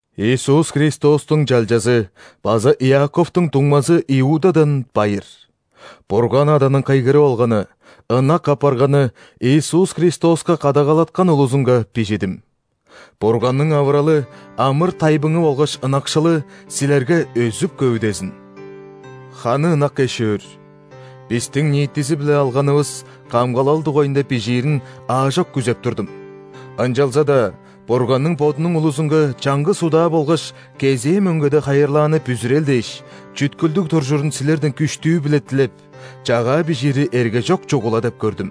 Иисус Христостуң чалчазы база Иаковтуң дуңмазы Иудадан байыр. Бурган Аданың кыйгырып алганы, ынак апарганы, Иисус Христоска кадагалаткан улузунга бижидим. Бурганның авыралы, амыр-тайбыңы болгаш ынакшылы силерге өзүп-көвүдезин!. Ханы ынак эш-өөр, бистиң ниитизи-биле алганывыс камгалал дугайында бижиирин аажок күзеп турдум, ынчалза-даа Бурганның Бодунуң улузунга чаңгыс удаа болгаш кезээ мөңгеде хайырлааны бүзүрел дээш чүткүлдүг туржурун силерден күштүү-биле дилеп, чагаа бижиири эргежок чугула деп көрдүм.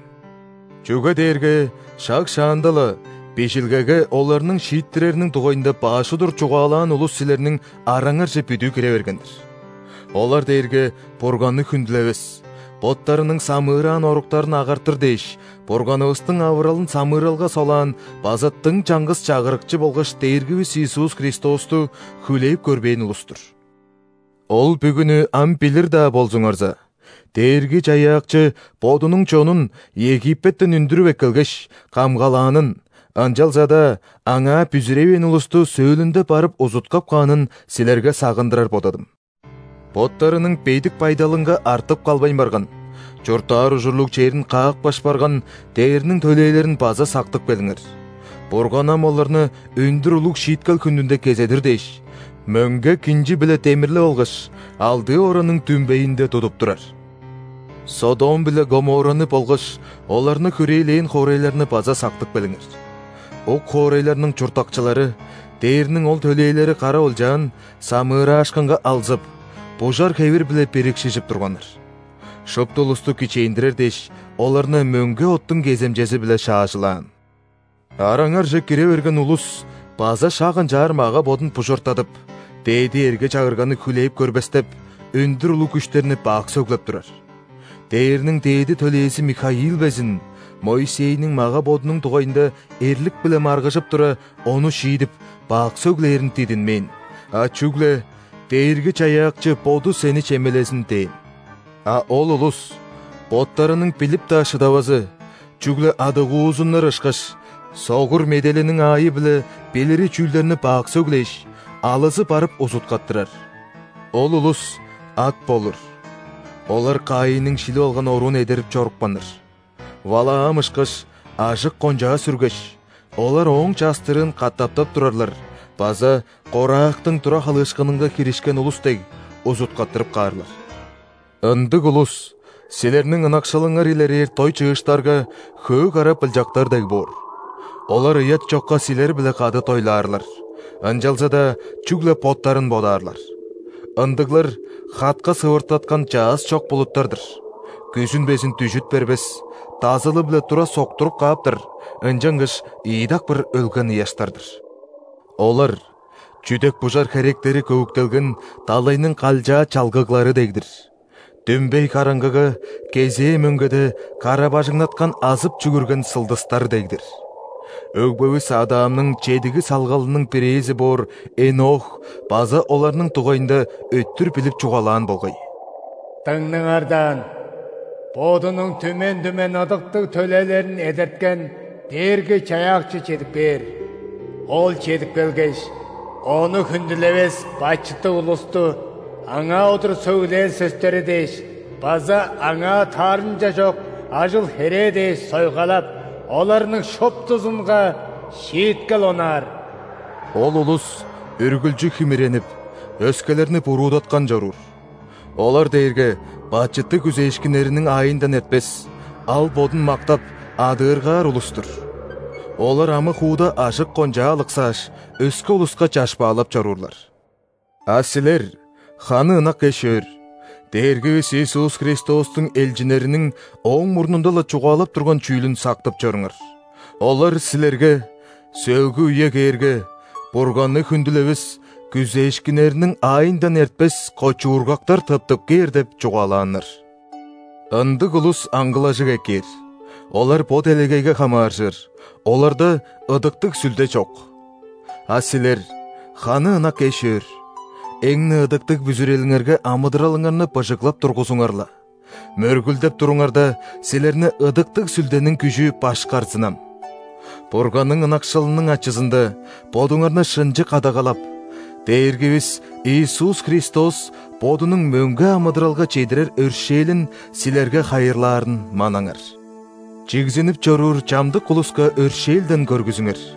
Чүге дээрге шаг шаанда-ла Бижилгеге оларның шииттирериниң дугайында баш удур чугаалаан улус силерниң араңарже бүдүү кире берген-дир. Олар дээрге Бурганны хүндүлевес, боттарының самыыраан оруктарын агартыр дээш Бурганывыстың авыралын самыыралга солаан база дың чаңгыс Чагырыкчы болгаш Дээргивис Иисус Христосту хүлээп көрбээн улус-тур. Ол бүгүнү ам билир-даа болзуңарза, Дээрги-Чаяакчы Бодунуң чонун Египеттен үндүрүп эккелгеш, камгалаанын, ынчалза-даа Аңаа бүзүревээн улусту сөөлүнде барып узуткап каанын силерге сагындырар бодадым. Боттарының бедик байдалынга артып калбайн барган, чурттаар ужурлуг черин каапкаш барган ·дээрниң төлээлерин база сактып келиңер. Бурган ам оларны өндүр улуг шииткел хүнүнде кезедир дээш, мөңге кинчи-биле демирлеп алгаш, алдыы оранның дүмбейинде тудуп турар. Содом биле Гоморраны болгаш оларны хүрээлээн хоорайларны база сактып келиңер. Ук хоорайларның чурттакчылары, дээрниң ол төлээлери кара олчаан, самыыраашкынга алзып, бужар хевир-биле бирикшижип турганнар. Шупту улусту кичээндирер дээш, оларны мөңге оттуң кеземчези-биле шаажылаан. Араңарже кире берген улус база шак ынчаар мага-бодун бужартадып, дээди эрге-чагырганы хүлээп көрбестеп, өндүр улуг күштерни бак сөглеп турар. Дээрниң дээди төлээзи Михаил безин, Моисейниң мага-бодунуң дугайында эрлик-биле маргыжып тура, ону шиидип, бак сөглээрин дидинмээн, а чүгле: «Дээрги-Чаяакчы Боду сени чемелезин» – дээн. А ол улус боттарының билип-даа шыдавазы, чүгле адыгуузуннар ышкаш, согур меделиниң аайы-биле билири чүүлдерни бак сөглээш, алызы барып узуткаттырар. Ол улус ат болур! Олар Каинниң шилип алган оруун эдерип чорупканнар. Валаам ышкаш, ажык-кончаа сүргеш, олар ооң частырыын катаптап турарлар база, Корахтың тура халыышкынынга киришкен улус дег, узуткаттырып каарлар. Ындыг улус силерниң ынакшылыңар илерээр дой-чыыштарга хөө кара былчактар дег боор. Олар ыят чокка силер-биле кады дойлаарлар, ынчалза-даа чүгле боттарын бодаарлар. Ындыглар – хатка сывыртаткан чаъс чок булуттар-дыр; күзүн безин дүжүт бербес, дазылы-биле тура соктуруп кааптар, ынчангаш ийи дакпыр өлген ыяштар-дыр. Олар чүдек-бужар херектери көвүктелген далайның калчаа чалгыглары дег-дир; дүмбей караңгыга кезээ мөңгеде кара-бажыңнаткан азып чүгүрген сылдыстар дег-дир. Өгбевис Адамның чедиги салгалының бирээзи боор Энох база оларның дугайында өттүр билип чугаалаан болгай: «Дыңнаңар даан, Бодунуң түмен-түмен ыдыктыг төлээлерин эдерткен Дээрги-Чаяакчы чедип кээр. Ол чедип келгеш, Ону хүндүлевес бачыттыг улусту Аңаа удур сөглээн сөстери дээш база Аңаа таарымча чок ажыл-херээ дээш сойгалап, оларның шуптузунга шииткел онаар». Ол улус үргүлчү химиренип, өскелерни буруудаткан чоруур. Олар дээрге бачыттыг күзээшкиннериниң аайындан эртпес, ал-бодун мактап, адыыргаар улус-тур. Олар амы-хууда ажык-кончаа алыксааш, өске улуска чашпаалап чоруурлар. А силер, ханы ынак эш-өөр, Дээргивис Иисус Христостуң элчиннериниң ооң мурнунда-ла чугаалап турган чүүлүн сактып чоруңар. Олар силерге: «Сөөлгү үе кээрге, Бурганны хүндүлевес күзээшкиннериниң аайындан эртпес кочуургактар тыптып кээр» – деп чугаалааннар. Ындыг улус аңгылажыг эккээр, олар бо делегейге хамааржыр, оларда Ыдыктыг Сүлде чок. А силер, ханы ынак эш-өөр, эң-не ыдыктыг бүзүрелиңерге амыдыралыңарны быжыглап тургузуңар-ла, мөргүлдеп туруңарда, силерни Ыдыктыг Сүлдениң күжү башкарзынам. Бурганның ынакшылының ачызында бодуңарны шынчы кадагалап, Дээргивис Иисус Христос Бодунуң мөңге амыдыралга чедирер өршээлин силерге хайырлаарын манаңар. Чигзинип чоруур чамдык улуска өршээлден көргүзүңер.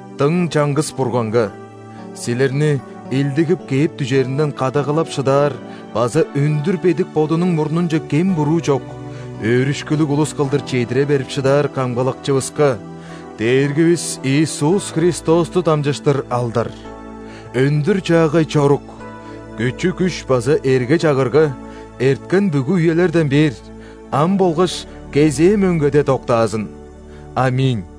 Дың чаңгыс Бурганга – силерни илдигип кээп дүжеринден кадагалап шыдаар база өндүр бедик Бодунуң мурнунче кем-буруу чок, өөрүшкүлүг улус кылдыр чедире берип шыдаар Камгалакчывыска – Дээргивис Иисус Христосту дамчыштыр алдар, өндүр-чаагай чорук, күчү-күш база эрге-чагырга эрткен бүгү үелерден бээр, ам болгаш кезээ мөңгеде доктаазын! ·Аминь.